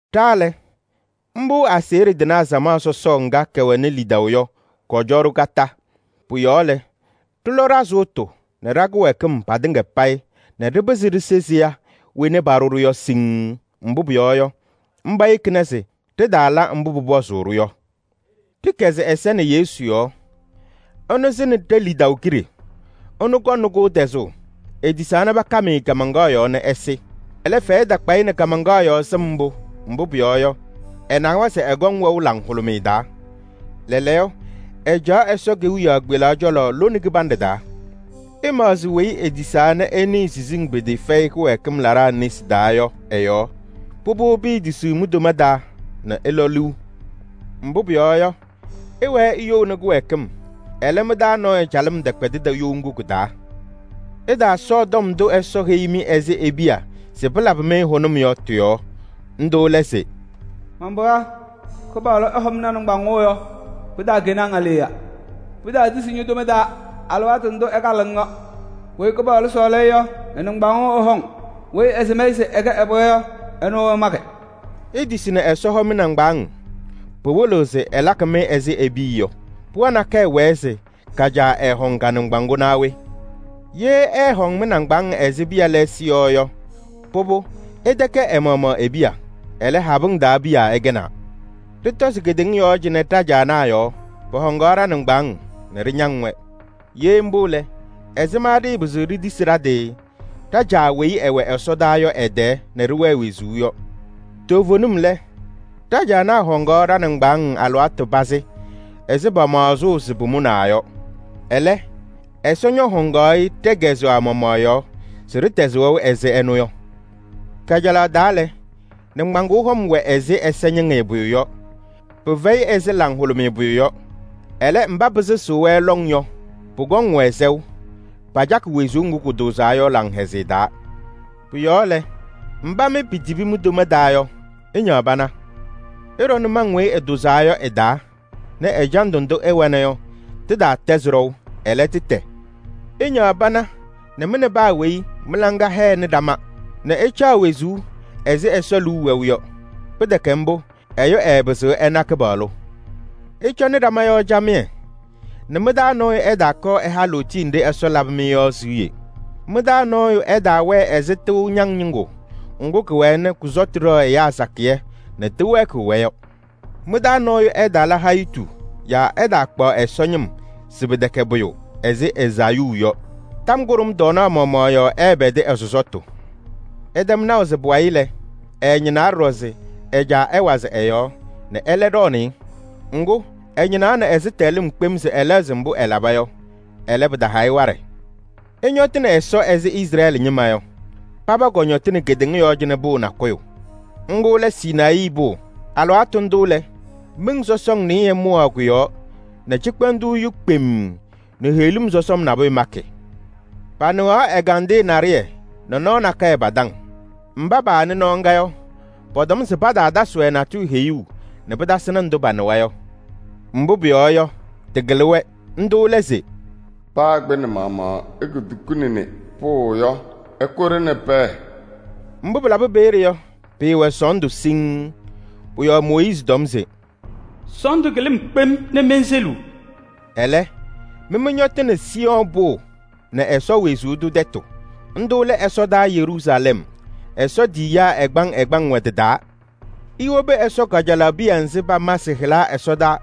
Ɖa lɛ, mbʋ aseɣɖe tɩnaa samaɣ ŋga kɛwɛnɩ lidaʋ yɔ, kɔcɔ-ɖʋ kondiko. Pʋ-yɔɔ lɛ, ɖɩlɔ ɖa-sʋʋtʋ nɛ ɖa-kɩwɛɛkɩm patɩŋa payɩ nɛ ɖɩpɩzɩ ɖise seya wena paɖʋ-ɖʋ yɔ siŋŋ. Mbʋ pʋyɔɔ yɔ, mba yekina se ɖɩtaala mbʋ pʋpɔzʋʋ-ɖʋ yɔ. Ɖɩkɛzɩ ɛza nɛ Yesu yɔɔ: ɛnʋ sɩnɩ ɖe-lidaʋ kiɖe, ɛnʋ kɔŋnɩ-kʋ tɛzʋʋ. Etisaa nɛ pakam-ɩ kaamaŋkaɣ yɔɔ nɛ ɛsɩ. Ɛlɛ, fɛyɛ takpa-ɩ nɛ kaamaŋkaɣ yɔɔ sɩm mbʋ, mbʋ pʋyɔɔ yɔ, ɛnawa se ɛkɔŋ wɛʋ laŋhʋlʋmɩyɛ taa. Lɛɛlɛɛyɔ, ɛcaɣ Ɛsɔ kewiyaɣ kpelaɣ cɔlɔ lone kɩbanɖɛ taa. Ɩmaɣzɩ weyi etisaa nɛ ɛnɩɩ siziŋ pɩtɩɩfɛyɩ kɩwɛɛkɩm laɖaa nesi taa yɔ ɛ-yɔɔ. Pʋbʋ, piitisiɣ mi-toma taa nɛ ɩlɔ liu. Mbʋ pʋyɔɔ yɔ, ɩwɛɛ iyouni kɩwɛɛkɩm. Ɛlɛ, mɩ-taa nɔɔyʋ calɩm tɛkpɛdɩdɩ you ŋgʋ kɩ-taa. Ɩtaasɔɔ tɔm ndʋ Ɛsɔ heyi-mɩ ɛzɩ e-piya se pɩlabɩ-mɩ hʋnʋm yɔ tɩ-yɔɔ. Ndʋ lɛ se: “Man-pɩɣa, Kɩpaɣlʋ ɛhɔŋ ña-nɩŋgbaŋʋʋ yɔ, pɩtaakɛnɩ-ŋ aleɣya. Pɩtaatisi ño-toma taa alɩwaatʋ ndʋ ɛkalɩɣ-ŋ yɔ. Weyi Kɩpaɣlʋ sɔɔlɩ-ɩ yɔ, ɛ-nɩŋgbaŋʋʋ ɛhɔŋ, weyi ɛsɩm-ɩ se ɛkɛ ɛ-pɩɣa yɔ, ɛnʋ ɛmakɩ.” Itisi nɛ Ɛsɔ hɔ mɩ-nɩŋgbaaŋ: pɩwɩlɩɣ se ɛlakɩ-mɩ ɛzɩ e-piya yɔ. Pɩɣa nakɛyɛ wɛɛ se ka-caa ɛɛhɔŋ ka-nɩŋgbaŋʋʋ naa we? Ye ɛɛhɔŋ mɩ-nɩŋgbaaŋ ɛzɩ piya lɛɛsɩ yɔ yɔ, pʋbʋ, ɩtɛkɛ ɛ-maɣmaɣ e-piya. Ɛlɛ, habɩŋ taa piya ɩkɛnaa. Ɖɩtɔzɩ kedeŋa yɔɔ cɩnɛ ɖa-caanaa yɔɔ: pɔhɔŋaɣ ɖa-nɩŋgbaaŋ nɛ ɖɩñaŋ-wɛ. Ye mbʋ lɛ, ɛzɩma ɖɩɩpɩzɩɣ ɖitisi ɖa-tɩ ɖa-Caa weyi ɛwɛ ɛsɔdaa yɔ ɛ-tɛɛ nɛ ɖɩwɛɛ wezuu yɔ? Toovenim lɛ, ɖa-caanaa hɔŋaɣ ɖa-nɩŋgbaaŋ alɩwaatʋ pazɩ ɛzɩ pamaɣzʋʋ se pʋmʋnaa yɔ. Ɛlɛ, Ɛsɔ ñɔhɔŋ-ɩ ɖɛ-kɛzɛɣ maɣmaɣ yɔɔ se ɖɩtɛzɩ wɛʋ ɛzɩ ɛnʋ yɔ. Kajalaɣ taa lɛ, nɩŋgbaŋʋʋ hɔm wɛ ɛzɩ ɛzɩñɩŋɩyɛ pʋyʋ yɔ, pɩfɛyɩ ɛzɩ laŋhʋlʋmɩyɛ pʋyʋ yɔ. Ɛlɛ, mba pɩsɩɣzɩ-wɛ lɔŋ yɔ, pʋkɔŋ-wɛ sɛʋ: pacakɩ wezuu ŋgʋ kʋtʋʋzaa yɔ laŋhɛzɩyɛ taa. Pʋ-yɔɔ lɛ, mba mɩ pitibi mi-toma taa yɔ, ɩñaɣ pana. Ɩɖɔ nʋmɔŋ weyi ɩtʋʋzaa yɔ ɩ-taa nɛ ɛjandʋ ndʋ ɩwɛna yɔ tɩtaatɛzɩ ɖɔʋ, ɛlɛ, tɩtɛ. Ɩñaɣ pana nɛ mɩ nɛ paa weyi mɩ-laŋa hɛnɩ ɖama nɛ ɩcaɣ wezuu ɛzɩ Ɛsɔ liu wɛʋ yɔ. Pɩtɛkɛ mbʋ, ɛyʋ ɛɛpɩzɩɣ ɛna Kɩpaɣlʋ. Ɩcɔnɩ ɖama yɔɔ camɩyɛ nɛ mɩ-taa nɔɔyʋ ɛtaakɔɔ ɛha lootiye nɖɩ Ɛsɔ labɩ-mɩ yɔ siɣye. Mɩ-taa nɔɔyʋ ɛtaawɛɛ ɛzɩ tɩʋ ñaŋ ñɩŋgʋ ŋgʋ kɩwɛɛ nɛ kʋ-sɔtʋ ɖɛɣ ɛyaa sakɩyɛ nɛ tɩwɛɛkɩɣ-wɛ yɔ. Mɩ-taa nɔɔyʋ ɛtaala hayitu yaa ɛtaakpaɣ Ɛsɔ ñɩm se pɩtɛkɛ pʋyʋ ɛzɩ Ezaayuu yɔ. Tɔm kʋɖʋm tɔɔnaɣ maɣmaɣ yɔɔ ɛɛpɛdɩ ɛ-sɔsɔtʋ. Ɩtɛm naʋ se pʋwayɩ lɛ, ɛɛñɩnaa ɖɔɖɔ se ɛ-caa ɛwazɩ ɛ-yɔɔ nɛ ɛlɛ ɖɔɔnɩ-ɩ. Ŋgʋ, ɛñɩnaɣnɩ ɛzɩtɛɣlɩm kpem se ɛlɛɣzɩ mbʋ ɛlaba yɔ. Ɛlɛ, pɩtaha-ɩ waɖɛ. Ɩtɔñɔtɩnɩ Ɛsɔ ɛzɩ Izrɛɛlɩ ñɩma yɔ. Paba kɔñɔtɩnɩ kedeŋa yɔɔ cɩnɛ pʋʋ nakʋyʋ: ŋgʋ lɛ Sinayii Pʋʋ. Alɩwaatʋ ndʋ lɛ, miŋ sɔsɔŋ nɩɩyɩ mʋwaɣ kʋ-yɔɔ nɛ cɩkpɛndʋʋ yu kpemm nɛ heɣlim sɔsɔm nabʋyʋ makɩ. Panɩɣaɣ ɛgandɩyɛ naɖɩyɛ nɛ nɔɔ nakɛyɛ pa-taŋ. Mba paanɩ nɔɔ ŋga yɔ, pɔtɔm se pataatasɩ-wɛ natʋyʋ heyuu nɛ pɩtasɩnɩ ndʋ panɩwa yɔ, mbʋ pʋyɔɔ yɔ, tɩkɩlɩ-wɛ. Ndʋ lɛ se: “Paa kpɩnɛ maɣmaɣ etukunini pʋʋ yɔ, ɩkʋ-ɖɩ nɛ pɛɛ.” Mbʋ pɩlabɩ peeye yɔ, pɩɩwɛ sɔɔndʋ siŋŋ. Pʋ-yɔɔ Mooyiizi tɔm se: “Sɔɔndʋ kɩlɩ-m kpem nɛ menseliɣ.” Ɛlɛ, mɩ mɩñɔtɩnɩ Siiyɔɔ Pʋʋ nɛ Ɛsɔ wezuu tʋ tɛtʋ: ndʋ lɛ ɛsɔdaa Yeruusalɛm, Ɛsɔ tiyiyaa ɛgbaŋ ɛgbaŋ wɛ tɩ-taa. Iwobi Ɛsɔ kajalaɣ piya nzɩ pama sɩ-hɩla ɛsɔdaa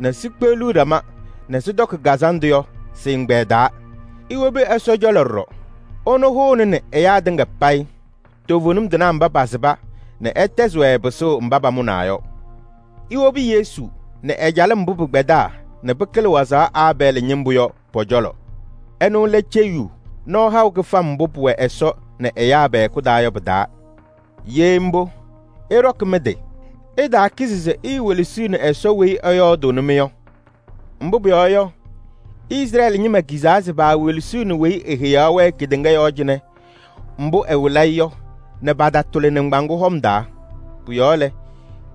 nɛ sikpeɣli ɖama nɛ sɩtɔkɩ kazanɖʋ yɔ sɩ-ɛgbɛyɛ taa. Iwobi Ɛsɔ cɔlɔ ɖɔɖɔ, ɛnʋ hʋʋnɩnɩ ɛyaa tɩŋa payɩ: toovenim tɩnaa mba pasɩba nɛ ɛtɛzɩ-wɛ pɩsʋʋ mba pamʋnaa yɔ. Iwobi Yesu nɛ ɛ-calɩm mbʋ pɩkpɛdaa nɛ pɩkɩlɩ wazaɣ Aabɛɛlɩ ñɩmbʋ yɔ pɔ-cɔlɔ. Ɛnʋ lɛ ceyiyu nɔɔ haʋ kɩfam mbʋ pʋwɛ Ɛsɔ nɛ ɛyaa pɛ-hɛkʋ taa yɔ pɩ-taa. Ye mbʋ, ɩɖɔkɩ mɩ-tɩ! Ɩtaakizi se iiwelesiɣni Ɛsɔ weyi ɛyɔɔdʋʋnɩ-mɩ yɔ. Mbʋ pʋyɔɔ yɔ, Izrɛɛlɩ ñɩma kizaa se paawelesiɣni weyi eheyaɣ-wɛ kedeŋa yɔɔ cɩnɛ mbʋ ɛwɩlɩ-ɩ yɔ nɛ patatʋlɩ nɩŋgbaŋʋʋ hɔm taa. Pʋ-yɔɔ lɛ,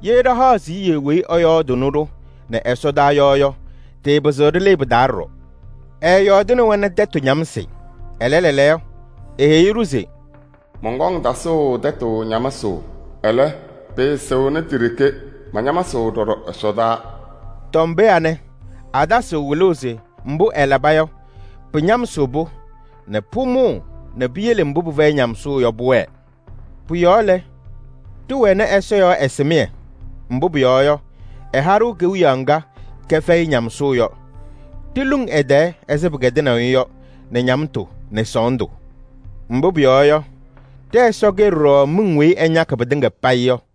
ye ɖa ɖahaɣ siɣye weyi ɛyɔɔdʋʋnɩ-ɖʋ nɛ ɛsɔdaa yɔ yɔ, ɖɩɩpɩzɩɣ ɖɩlɩɩ pɩ-taa ɖɔɖɔ. Ɛɛyɔɔdɩnɩ-wɛ nɛ tɛtʋ ñamsɩ, ɛlɛ, lɛɛlɛɛyɔ eheyi-ɖʋ se: “Mɔnkɔŋ tasʋʋ tɛtʋ ñamsʋʋ. Ɛlɛ, pɩɩsɩɣnɩ ti-ɖeke, mañamsɩɣ ɖɔɖɔ ɛsɔtɔnʋʋ.” Tɔm pee anɛ, atasɩɣ wɩlʋʋ se mbʋ ɛlaba yɔ, pɩñamsɩɣ-pʋ nɛ pʋmʋʋ nɛ piyele mbʋ pɩfɛyɩ ñamsʋʋ yɔ pʋwɛɛ. Pʋ-yɔɔ lɛ, ɖɩwɛnɩ Ɛsɔ yɔɔ ɛsɩmɩyɛ, mbʋ pʋyɔɔ yɔ, ɛha-ɖʋ kewiyaɣ ŋga kɛfɛyɩ ñamsʋʋ yɔ: ɖiluŋ ɛ-tɛɛ ɛzɩ pɩkɛdɩnaʋ-ɩ yɔ nɛ ñamtʋ nɛ sɔɔndʋ. Mbʋ pʋyɔɔ yɔ, ɖɛ-Ɛsɔ kɛ ɖɔɖɔ miŋ weyi ɛñakɩ pɩtɩŋa payɩ yɔ.